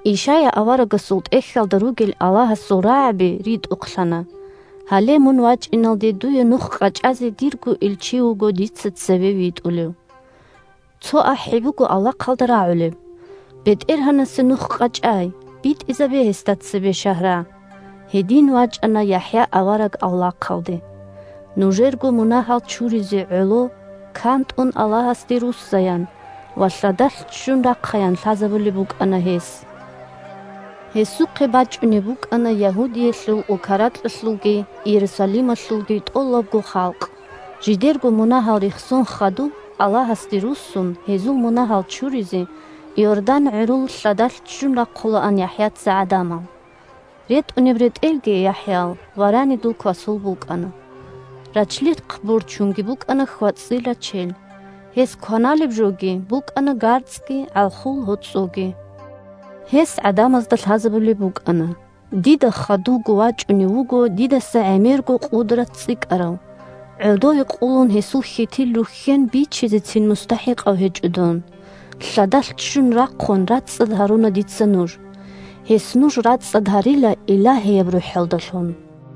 Ишая аварагасул тӀехьалда ругел Аллагьасул рагӀаби ритӀухълъана: «Гьале, мун вачӀиналде дуе нух къачӀазе дирго илчи Илчи – Аллагьас витӀарав чи. вуго дица цеве витӀулев»; «Цо ахӀи буго авлахъалда рагӀулеб: – БетӀергьанасе нух къачӀай, битӀизабе гьесда цебе шагьра!» Гьедин вачӀана ЯхӀя авараг авлахъалде. Нужерго мунагьал чуризе гӀоло, кантӀун Аллагьасде руссаян ва лъадалъ ччун рахъаян лъазабулеб букӀана гьес. Гьесухъе бачӀунеб букӀана Ягьудиялъул улка-ракьалъулги Иерусалималъулги тӀолабго халкъ. Жидерго мунагьал рехсон хадуб, Аллагьасде руссун, гьезул мунагьал чуризе Иордан гӀурул лъадалъ ччун рахъулаан ЯхӀяца гӀадамал. РетӀунеб ретӀелги ЯхӀял варанидул квасул букӀана, рачлихъ борчунги букӀана хьвацӀил рачел. Гьес кваналеб жоги букӀана гарцӀги гӀалхул гьоцӀоги. Гьес гӀадамазда лъазабулеб букӀана: – Дида хадувго вачӀунев вуго дидаса гӀемерго къудрат цӀикӀкӀарав. ГӀодове къулун гьесул хьитил рухьен бичизецин мустахӀикъав гьечӀо дун. Лъадалъ ччун рахъун, рацӀцӀад гьаруна дица нуж. Гьес нуж рацӀцӀад гьарила Илагьияб РухӀалдалъун.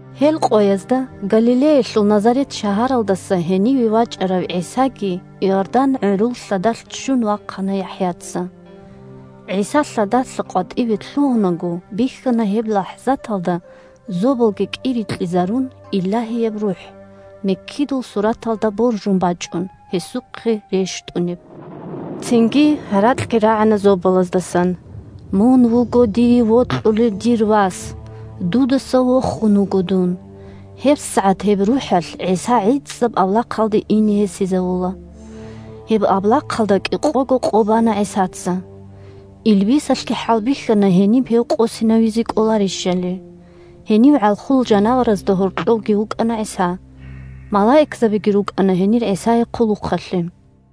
Гьел къоязда Галилеялъул Назарет шагьаралдаса гьениве вачӀарав ГӀисаги Иордан гӀурул лъадалъ ччун вахъана ЯхӀяца. ГӀиса лъадалъа къватӀиве лъугьунаго, бихьана гьеб лахӀзаталда, зобалги кӀирикьизарун, Илагьияб РухӀ, миккидул сураталда боржун бачӀун, гьесухъе рещтӀунеб. Цинги гьаракьги рагӀана зобалаздасан: – Мун вуго дие вокьулев дир Вас! Дудаса вохун вуго дун! ГьебсагӀат гьеб РухӀалъ ГӀиса гӀицӀаб авлахъалде ине гьесизавула. Гьеб авлахъалда кӀикъого къо бана ГӀисаца. Илбисалъги хӀалбихьана гьениб гьев къосинавизе кӀоларищали. Гьенив гӀалхул жанаваразда гьоркьовги вукӀана ГӀиса. Малаикзабиги рукӀана гьенир ГӀисае хъулухъалъе.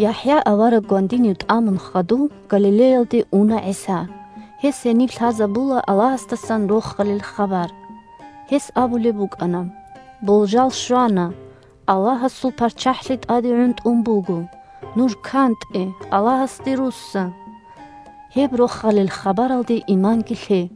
ЯхӀя авараг гвандинив тӀамун хадув Галилеялде уна ГӀиса. Гьес гьениб лъазабула Аллагьасдасан Рохалил хабар. Гьес абулеб букӀана: – Болжал щвана! Аллагьасул ПарччахӀлъи тӀаде гӀунтӀун буго! Нуж кантӀе, Аллагьасде русса! Гьеб Рохалил хабаралде иманги лъе!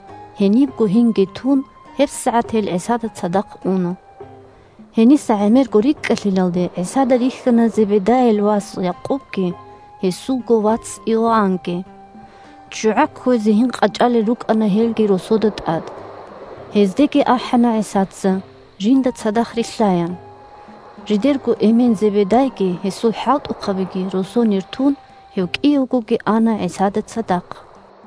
Гьенибго гьинги тун, гьебсагӀат гьел ГӀисада цадахъ уна. Гьениса гӀемерго рикӀкӀалъилалде, ГӀисада рихьана Зебедайил вас Якъубги гьесулго вац Иоаннги. ЧчугӀа кквезе гьин къачӀалел рукӀана гьелги росода тӀад. Гьездеги ахӀана ГӀисаца, жинда цадахъ рилълъаян. Жидерго эмен Зебедайги гьесул хӀалтӀухъабиги росонир тун, гьев кӀиявгоги ана ГӀисада цадахъ.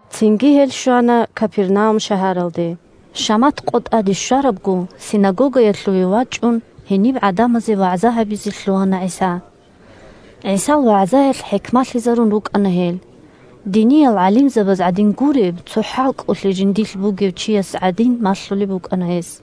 Цинги гьел щвана Капернаум шагьаралде. Шамат къо тӀаде щварабго, синагогаялъувеги вачӀун, гьениб гӀадамазе вагӀза гьабизе лъугьана ГӀиса. ГӀисал вагӀзаялъ хӀикмалъизарун рукӀана гьел. Диниял гӀалимзабаз гӀадин гуреб, цо хӀалкӀолъи жиндилъ бугев чияс гӀадин малъулеб букӀана гьес.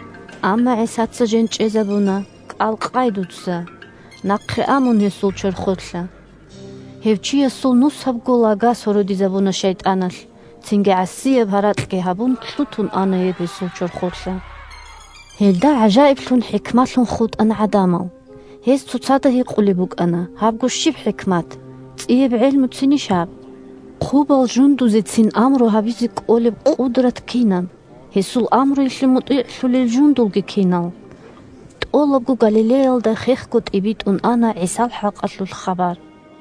Амма ГӀисаца жен чӀезабуна: – КӀал къай дуца! Нахъе а мун гьесул чорхолъа! Гьев чиясул нусабго лага сородизабуна шайтӀаналъ. Цинги гӀасияб гьаракьги гьабун, лъутун ана гьеб гьесул чорхолъа. Гьелда гӀажаиблъун-хӀикмалъун хутӀана гӀадамал. Гьез цоцазда гьикъулеб букӀана: – Гьабго щиб хӀикмат? ЦӀияб гӀелмуцинищ гьаб? Хъубал жундузецин амру гьабизе кӀолеб къудрат кинаб, гьесул амруялъе мутӀигӀлъулел жундулги кинал? ТӀолабго Галилеялда хехго тӀибитӀун ана ГӀисал хӀакъалъулъ хабар.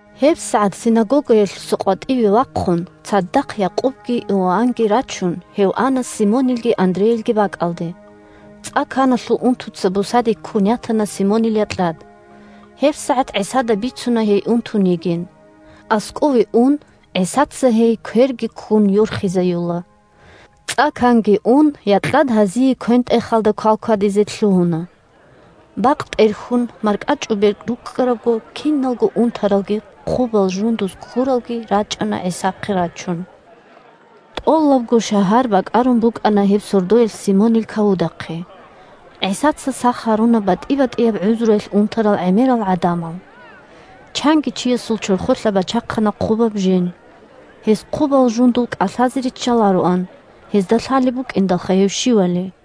ГьебсагӀат синагогаялъуса къватӀиве вахъун, цадахъ Якъубги Иоаннги рачун, гьев ана Симонилги Андрейилги бакӀалде. ЦӀа-каналъул унтуца бусаде ккун ятана Симонил якьад. ГьебсагӀат ГӀисада бицуна гьей унтун йигилан. АскӀове ун, ГӀисаца гьей, кверги ккун, йорхизаюла. ЦӀа-канги ун, якьад гьазие квен-тӀехалда квалквадизе лъугьуна. Бакъ тӀерхьун, маркӀачӀубер рукӀкӀарабго, киналго унтаралги хъубал жундуз ккуралги рачӀана ГӀисахъе рачун. ТӀолабго шагьар бакӀарун букӀана гьеб сордоялъ Симонил кавудахъе. ГӀисаца сах гьаруна батӀи-батӀияб гӀузруялъ унтарал гӀемерал гӀадамал. Чанги чиясул чорхолъа бачахъана хъубаб жен. Гьес хъубал жундул кӀалъазе риччалароан, гьезда лъалеб букӀиндалха гьев щивали.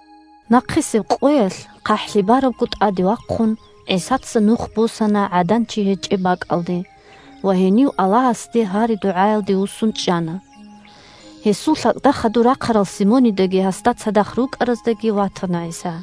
Нахъисеб къоялъ хъахӀлъи барабго тӀадеги вахъун, ГӀисаца нух босана гӀадан-чи гьечӀеб бакӀалде ва гьенив Аллагьасе гьари-дугӀаялде вуссун чӀана. Гьесул лъалкӀда хадур рахъарал Симонидаги гьасда цадахъ рукӀараздаги ватана ГӀиса.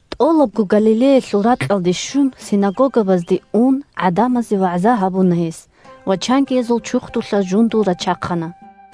ТӀолабго Галилеялъул ракьалде щун, синагогабазде ун, гӀадамазе вагӀза гьабуна гьес ва чангиязул чурхдулъа жундул рачахъана.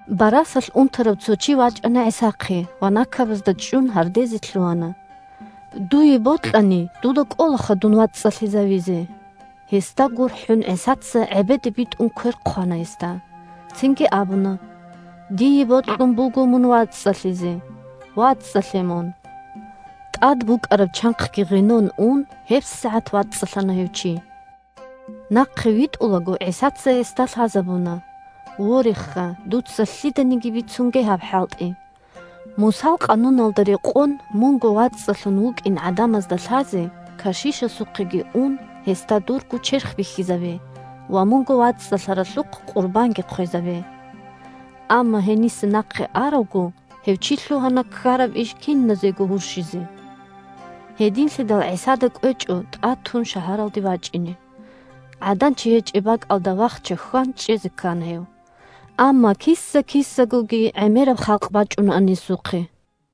Барасалъ унтарав цо чи вачӀана ГӀисахъе ва накабазда чӀун гьардезе лъугьана: – Дуе бокьани, дуда кӀолаха дун вацӀцӀалъизавизе! Гьесда гурхӀун ГӀисаца, гӀебеде битӀун квер хъвана гьесда. Цинги абуна: – Дие бокьун буго мун вацӀцӀалъизе. ВацӀцӀалъе мун! ТӀад букӀараб чанхъги гъенон ун, гьебсагӀат вацӀцӀалъана гьев чи. Нахъе витӀулаго, ГӀисаца гьесда лъазабуна: – Вореха, дуца лъиданиги бицунге гьаб хӀалтӀи! Мусал къануналда рекъон, мунго вацӀцӀалъун вукӀин гӀадамазда лъазе, кашишасухъеги ун, гьесда дурго черх бихьизабе ва мунго вацӀцӀалъаралъухъ къурбанги хъвезабе. Амма гьениса нахъе аравго, гьев чи лъугьана ккараб иш киназего гьурщизе. Гьединлъидал ГӀисада кӀвечӀо тӀатун шагьаралде вачӀине, гӀадан-чи гьечӀеб бакӀалда вахча-хьван чӀезе ккана. Амма киса-кисагоги гӀемераб халкъ бачӀунаан гьесухъе.